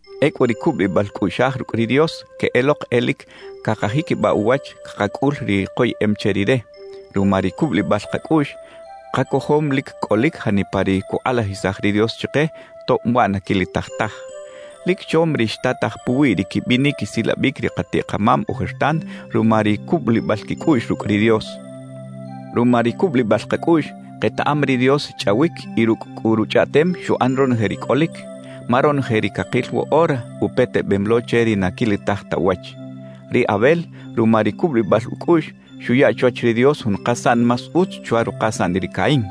Ecꞌu ri cubulibal cꞌuꞌxaj rucꞌ ri Dios queꞌelok e lic cakajiquibaꞌ uwach cakacꞌul ri koyeꞌem che Rire. Ruma ri cubulibal kacꞌuꞌx, kacojom lic cꞌolic janipa ri cukꞌalajisaj ri Dios chike, tob waꞌ na quilitaj taj. Lic chom ri xtataj puwi ri quibinic quisilabic ri katiꞌ-kamam ojertan ruma ri cubulibal quicꞌuꞌx rucꞌ ri Dios. Ruma ri cubulibal kacꞌuꞌx, ketaꞌam ri Dios xchꞌawic y rucꞌ cꞌu ruchꞌaꞌtem xuꞌan ronoje ri cꞌolic, ma ronoje ri cakil woꞌora upetebem lo che ri na quilitaj ta uwach. Ri Abel, ruma ri cubulibal ucꞌuꞌx, xuya chwach ri Dios jun kasaꞌn más utz chwa rukasaꞌn ri Caín.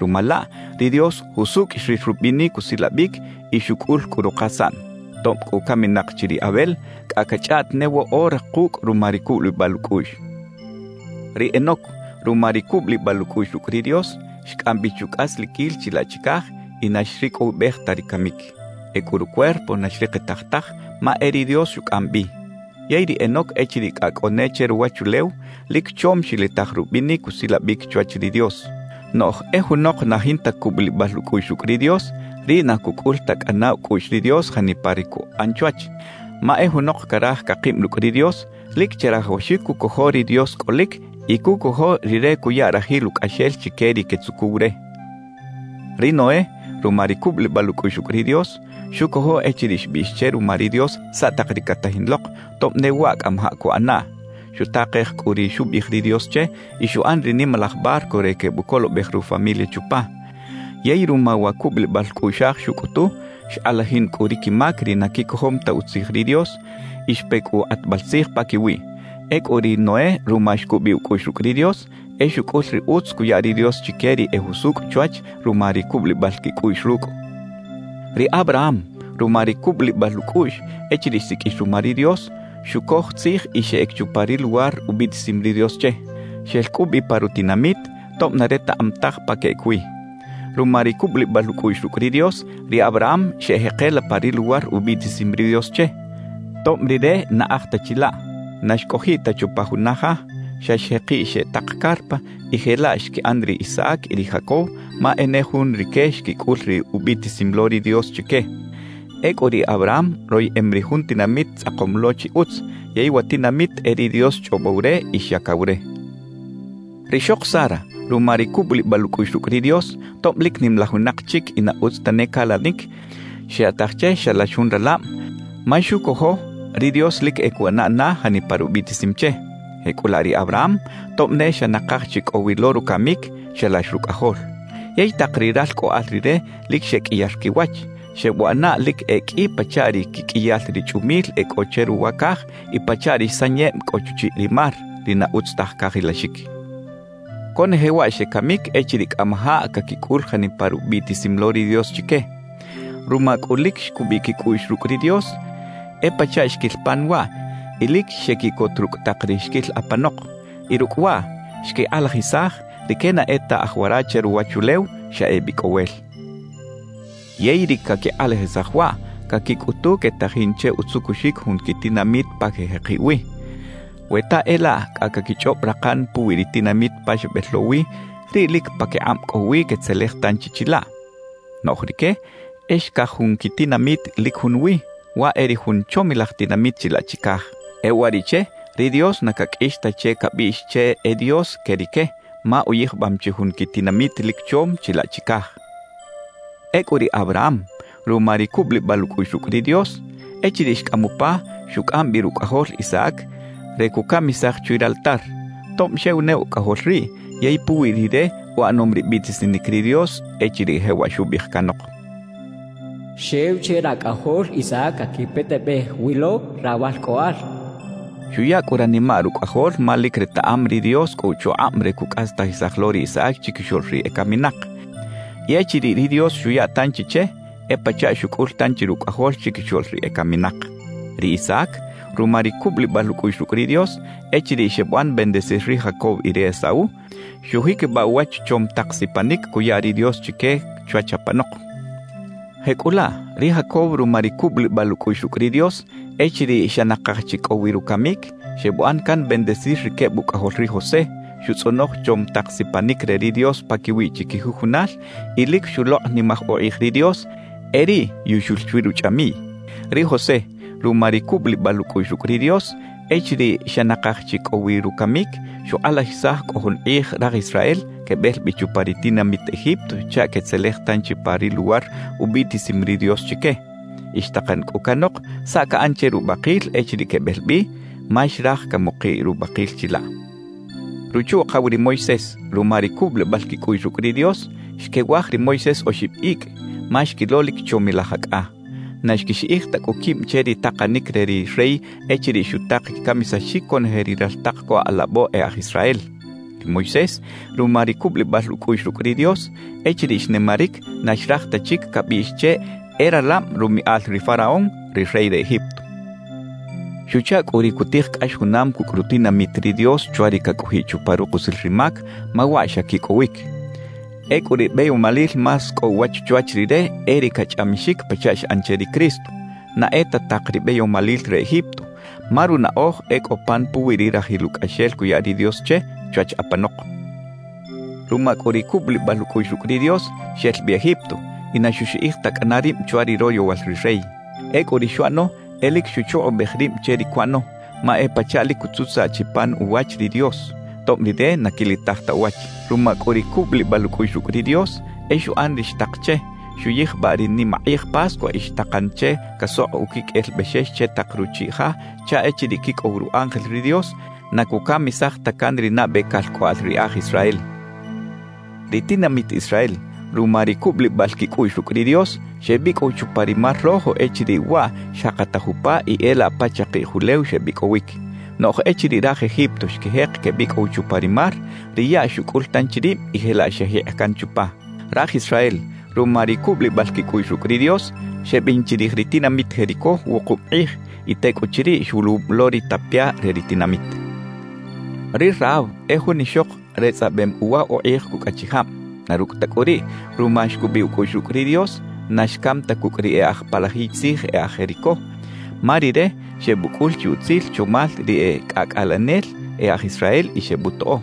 Ruma laꞌ, ri Dios jusucꞌ xril rubinic usilabic y xucꞌul cꞌu rukasaꞌn. Tob cꞌu caminak chi ri Abel, cꞌa cachꞌaꞌt ne woꞌora kucꞌ ruma ri cubulibal ucꞌuꞌx. Ri Enoc, ruma ri cubulibal ucꞌuꞌx rucꞌ ri Dios, xcꞌam bi chucꞌasliquil chilaꞌ chicaj y na xricꞌowibej ta ri camic. Ecꞌu rucuerpo na xrikitaj taj, ma e ri Dios xucꞌam bi. Yey ri Enoc echiriꞌ cꞌa cꞌo ne che ruwachulew, lic chom xilitaj rubinic usilabic chwach ri Dios. Noꞌj e junok na jinta cubulibal ucꞌuꞌx rucꞌ ri Dios, riꞌ na cucꞌul ta cꞌana ucꞌuꞌx ri Dios janipa ri cuꞌan chwach. Ma e junok caraj cakib rucꞌ ri Dios, lic chirajawaxic cucojo ri Dios cꞌolic y cucojo Rire cuya rajil ucꞌaxel chique ri quetzucuw re. Ri Noé, ruma ri cubulibal ucꞌuꞌx rucꞌ ri Dios, xucojo echiriꞌ xbiꞌx che ruma ri Dios saꞌ tak ri catajin lok, tob ne waꞌ cꞌamajaꞌ cuꞌanaꞌ. Xutakej cꞌu ri xubiꞌij ri Dios che y xuꞌan ri nimalaj barco re quebucolobej rufamilia chupa. Yey ruma wa cubulibal cꞌuꞌxaj xucꞌutu, xkꞌalajin cꞌu ri quimac ri na quicojom ta utzij ri Dios y xpe cꞌu kꞌatbal tzij paquiwiꞌ. Ecꞌu riꞌ ri Noé ruma xcubiꞌ ucꞌuꞌx rucꞌ ri Dios, e xucꞌul ri utz cuya ri Dios chique ri e jusucꞌ chwach ruma ri cubulibal quicꞌuꞌx rucꞌ. Ri Abraham, ruma ri cubulibal ucꞌuꞌx, echiriꞌ xsiqꞌuix ruma ri Dios, xucoj tzij y xeꞌec chupa ri luwar ubiꞌtisim ri Dios che. Xel cꞌu bi pa rutinamit, tob na retaꞌam taj pa queꞌec wi. Ruma ri cubulibal ucꞌuꞌx rucꞌ ri Dios, ri Abraham xeꞌjekela pa ri luwar ubiꞌtisim ri Dios che, tob rire na aj ta chilaꞌ. Na xcꞌojiꞌ ta chupa juna ja; xa xjekiꞌ xeꞌ tak carpa, y jelaꞌ xquiꞌan ri Isaac y ri Jacob, ma e ne jun rique xquicꞌul ri ubiꞌtisim lo ri Dios chique. Ecꞌu ri Abraham royeꞌem ri jun tinamit tzꞌakom lo chi utz, yey wa tinamit e ri Dios xchꞌobow re y xyacaw re. Rixok Sara, ruma ri cubulibal ucꞌuꞌx rucꞌ ri Dios, tob lic nimalaj winak chic y na utz tane calanic, xyaꞌtaj che xalax jun ralab ma xucojo ri Dios lic e cuꞌana na janipa rubiꞌtisim che. Jecꞌulaꞌ ri Abraham, tob ne xa nakaj chi cꞌo wi lo rucamic, xalax rucꞌajol. Yey tak ri ralcꞌoꞌal rire lic xeqꞌuiyar quiwach, xebuꞌana lic e qꞌui pachaꞌ ri quiqꞌuiyal ri chꞌumil e cꞌo che ruwa caj y pachaꞌ ri sanyeb cꞌo chuchiꞌ ri mar, ri na utz taj cajilaxic. Conoje waꞌ xecamic echiriꞌ cꞌamajaꞌ caquicꞌul janipa rubiꞌtisim lo ri Dios chique. Ruma cꞌu lic xcubiꞌ quicꞌuꞌx rucꞌ ri Dios, e pachaꞌ xquil pan waꞌ y lic xequiꞌcot rucꞌ tak ri xquil apanok. Y rucꞌ waꞌ, xquikꞌalajisaj rique na e ta aj wara che ruwachulew, xa ebicꞌowel. Yey ri caquikꞌalajisaj waꞌ, caquicꞌutu quetajin che utzucuxic jun quitinamit pa quejekiꞌ wi. We ta e laꞌ cꞌa caquichꞌob rakan puwi ri tinamit pa xebel lo wi, riꞌ lic paquikꞌab cꞌo wi quetzelej tanchi chilaꞌ. Noꞌj rique e xcaj jun quitinamit lic junwi, waꞌ e ri jun chomilaj tinamit chilaꞌ chicaj. E uwariꞌche, ri Dios na caqꞌuix ta che cabiꞌx che e Dios que rique, ma uyijbam chi jun quitinamit lic chom chilaꞌ chicaj. Ecꞌu ri Abraham, ruma ri cubulibal ucꞌuꞌx rucꞌ ri Dios, echiriꞌ xcꞌam upa, xucꞌam bi rucꞌajol Isaac re cucamisaj chwi raltar, tob xew ne ucꞌajol riꞌ yey puwi rire uꞌanom ri biꞌtisinic ri Dios echiriꞌ jewaꞌ xubiꞌij canok: «Xew che racꞌajol Isaac caquipetebej wi lo rawalcꞌoꞌal» xchaꞌ. Xuya cꞌu ranimaꞌ rucꞌajol ma lic retaꞌam ri Dios cꞌo uchukꞌab re cucꞌastajisaj lo ri Isaac chiquixoꞌl ri ecaminak, y echiriꞌ ri Dios xuya tanchi che, e pachaꞌ xucꞌul tanchi rucꞌajol chiquixoꞌl ri ecaminak. Ri Isaac, ruma ri cubulibal ucꞌuꞌx rucꞌ ri Dios, echiriꞌ xebuꞌan bendecir ri Jacob y ri Esaú, xujiquibaꞌ uwach chom tak sipanic cuya ri Dios chique chwach apanok. Jecꞌulaꞌ, ri Jacob ruma ri cubulibal ucꞌuꞌx rucꞌ ri Dios, echiriꞌ xa nakaj chi cꞌo wi rucamic, xebuꞌan can bendecir ri queb ucꞌajol ri José, xutzꞌonoj chom tak sipanic re ri Dios paquiwiꞌ chiquijujunal y lic xulokꞌnimaj ukꞌij ri Dios e riꞌ yuxul chwi ruchꞌamiꞌy. Ri José, ruma ri cubulibal ucꞌuꞌx rucꞌ ri Dios, echiriꞌ xa nakaj chi cꞌo wi rucamic, xukꞌalajisaj cꞌo jun kꞌij raj Israel quebel bi chupa ri tinamit Egipto chaꞌ quetzelej tanchi pa ri luwar ubiꞌtisim ri Dios chique. Y xtakan cꞌu canok saꞌ caꞌan che rubakil echiriꞌ quebel bi, ma xraj camukiꞌ rubakil chilaꞌ. Ruchu-ukaw ri Moisés, ruma ri cubulibal quicꞌuꞌx rucꞌ ri Dios, xquewaj ri Moisés oxib icꞌ, ma xquilo lic chomilaj acꞌa. Na xquixiꞌij ta cꞌu quib che ri takanic re ri rey echiriꞌ xutak quicamisaxic conoje ri raltak co alabo e aj Israel. Ri Moisés, ruma ri cubulibal ucꞌuꞌx rucꞌ ri Dios, echiriꞌ xnimaric na xraj ta chic cabiꞌx che e ralab rumiꞌal ri faraón, ri rey re Egipto. Xuchaꞌ cꞌu ri cutij cꞌax junam cucꞌ rutinamit ri Dios chwa ri cacꞌojiꞌ chupa rukusil ri mac, ma waꞌ xa quicꞌowic. Ecꞌu ri beyomalil más cꞌo uwach chwach rire e ri cachꞌamixic pachaꞌ xꞌan che ri Cristo, na e ta tak ri beyomalil re Egipto; ma runaꞌoj e cꞌo pan puwi ri rajil ucꞌaxel cuya ri Dios che chwach apanok. Ruma cꞌu ri cubulibal ucꞌuꞌx rucꞌ ri Dios, xel bi Egipto y na xuxiꞌij ta cꞌana rib chwa ri royowal ri rey. Ecꞌu ri xuꞌano e lic xuchukꞌubej rib che ri cuꞌano, ma e pachaꞌ lic cutzutzaꞌ chi pan uwach ri Dios, tob Rire na quilitaj ta uwach. Ruma cꞌu ri cubulibal ucꞌuꞌx rucꞌ ri Dios, e xuꞌan ri xtak che; xuyijbaꞌ ri nimakꞌij Pascua y xtakan che casokꞌ uquiqꞌuel bexex che tak ruchiꞌ ja chaꞌ echiriꞌ quicꞌow ru ángel ri Dios, na cucamisaj ta can ri nabe calcꞌoꞌal ri e aj Israel. Ri tinamit Israel, ruma ri cubulibal quicꞌuꞌx rucꞌ ri Dios, xebicꞌow chupa ri mar Rojo echiriꞌ waꞌ xjakataj upa y e laꞌ pa chakiꞌj ulew xebicꞌowic. Noꞌj echiriꞌ raj Egipto xquijek quebicꞌow chupa ri mar, ri yaꞌ xucꞌul tanchi rib y jelaꞌ xejikꞌ can chupa. Raj Israel, ruma ri cubulibal quicꞌuꞌx rucꞌ ri Dios, xebin chirij ri tinamit Jericó wukub kꞌij, y tecꞌuchiriꞌ xwuluwub lo ri tapia re ri tinamit. Ri Rahab e jun ixok retzꞌabem uwa ukꞌij cucꞌ achijab; na rucꞌ ta cꞌu riꞌ, ruma xcubiꞌ ucꞌuꞌx rucꞌ ri Dios, na xcam ta cucꞌ ri e aj palajiy tzij e aj Jericó, ma rire xebucꞌul chi utzil chomal ri e cꞌacꞌalenel e aj Israel y xebutoꞌo.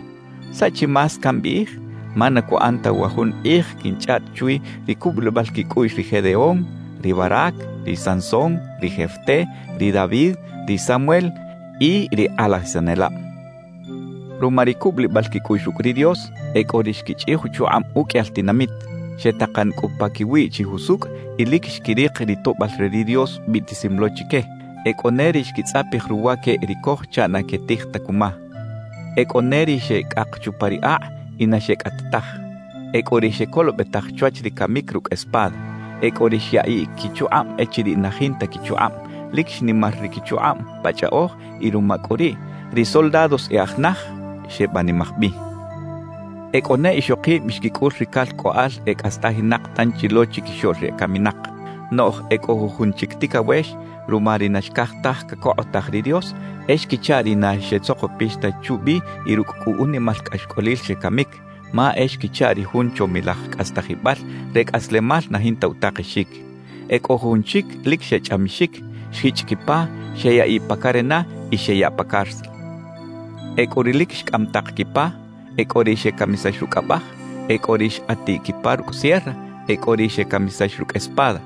¿Saꞌ chi más cambiꞌij? Ma na cuꞌan ta wa jun kꞌij quinchꞌaꞌt chwi ri cubulibal quicꞌuꞌx ri Gedeón, ri Barác, ri Sansón, ri Jefté, ri David, ri Samuel y ri kꞌalajisanelab. Ruma ri cubulibal quicꞌuꞌx rucꞌ ri Dios, e cꞌo ri xquichꞌij uchukꞌab uqꞌuiyal tinamit, xetakan cꞌu paquiwiꞌ chi jusucꞌ y lic xquirik ri toꞌbal re ri Dios biꞌtisim lo chique. E cꞌo ne ri xquitzꞌapij ruwaqueꞌ ri coj chaꞌ na quetij ta cuma. E cꞌo ne ri xecꞌak chupa ri akꞌ y na xecꞌat taj. E cꞌo ri xecolobetaj chwach ri camic rucꞌ espada. E cꞌo ri xyaꞌiꞌ quichukꞌab echiriꞌ na jinta quichukꞌab, lic xnimar ri quichukꞌab pa chꞌaꞌoj y ruma cꞌu riꞌ, ri soldados e aj naj xebanimaj bi. E cꞌo ne ixokib xquicꞌul ri calcꞌoꞌal e cꞌastajinak tanchi lo chiquixoꞌl ri ecaminak. Noꞌj e cꞌo jujun chic ticawex, ruma ri na xcaj taj cacokꞌotaj ri Dios, e xquichaꞌ ri na xetzokpix ta chubi y rucꞌ cꞌu unimal cꞌaxcꞌolil xecamic, ma e xquichaꞌ ri jun chomilaj cꞌastajibal re cꞌaslemal na jinta utakexic. E cꞌo jujun chic lic xechꞌamixic, xjichꞌ quipa, xeyaꞌiꞌ pa carena y xeyaꞌ pa cárcel. E cꞌo ri lic xcꞌam tak quipa, e cꞌo ri xecamisax rucꞌ abaj, e cꞌo ri xkꞌatiꞌ quipa rucꞌ sierra, e cꞌo ri xecamisax rucꞌ espada.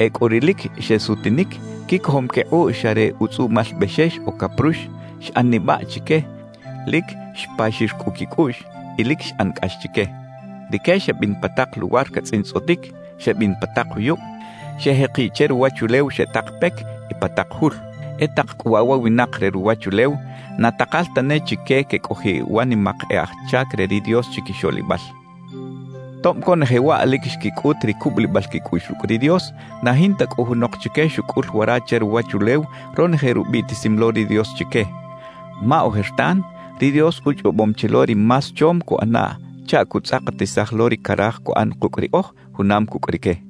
E cꞌo ri lic xesutinic quicojom quikꞌuꞌ xa re utzꞌuꞌmal bexex o caprux, xꞌan nibaꞌ chique, lic xpaxir cꞌu quicꞌuꞌx y lic xꞌan cꞌax chique. Rique xebin pa tak luwar catzꞌintzꞌotic, xebin pa tak juyub, xejekiꞌ che ruwachulew xeꞌ tak pec y pa tak jul. E tak cꞌu waꞌ wa winak re ruwachulew na takal tane chique quecꞌojiꞌ wa nimak e aj chac re ri Dios chiquixoꞌlibal. Tob conoje waꞌ lic xquicꞌut ri cubulibal quicꞌuꞌx rucꞌ ri Dios, na jinta cꞌu junok chique xucꞌul wara che ruwachulew ronoje rubiꞌtisim lo ri Dios chique. Ma ojertan ri Dios uchꞌobom chi lo ri más chom cuꞌanaꞌ chaꞌ cutzꞌakatisaj lo ri caraj cuꞌan kucꞌ riꞌoj junam cucꞌ rique.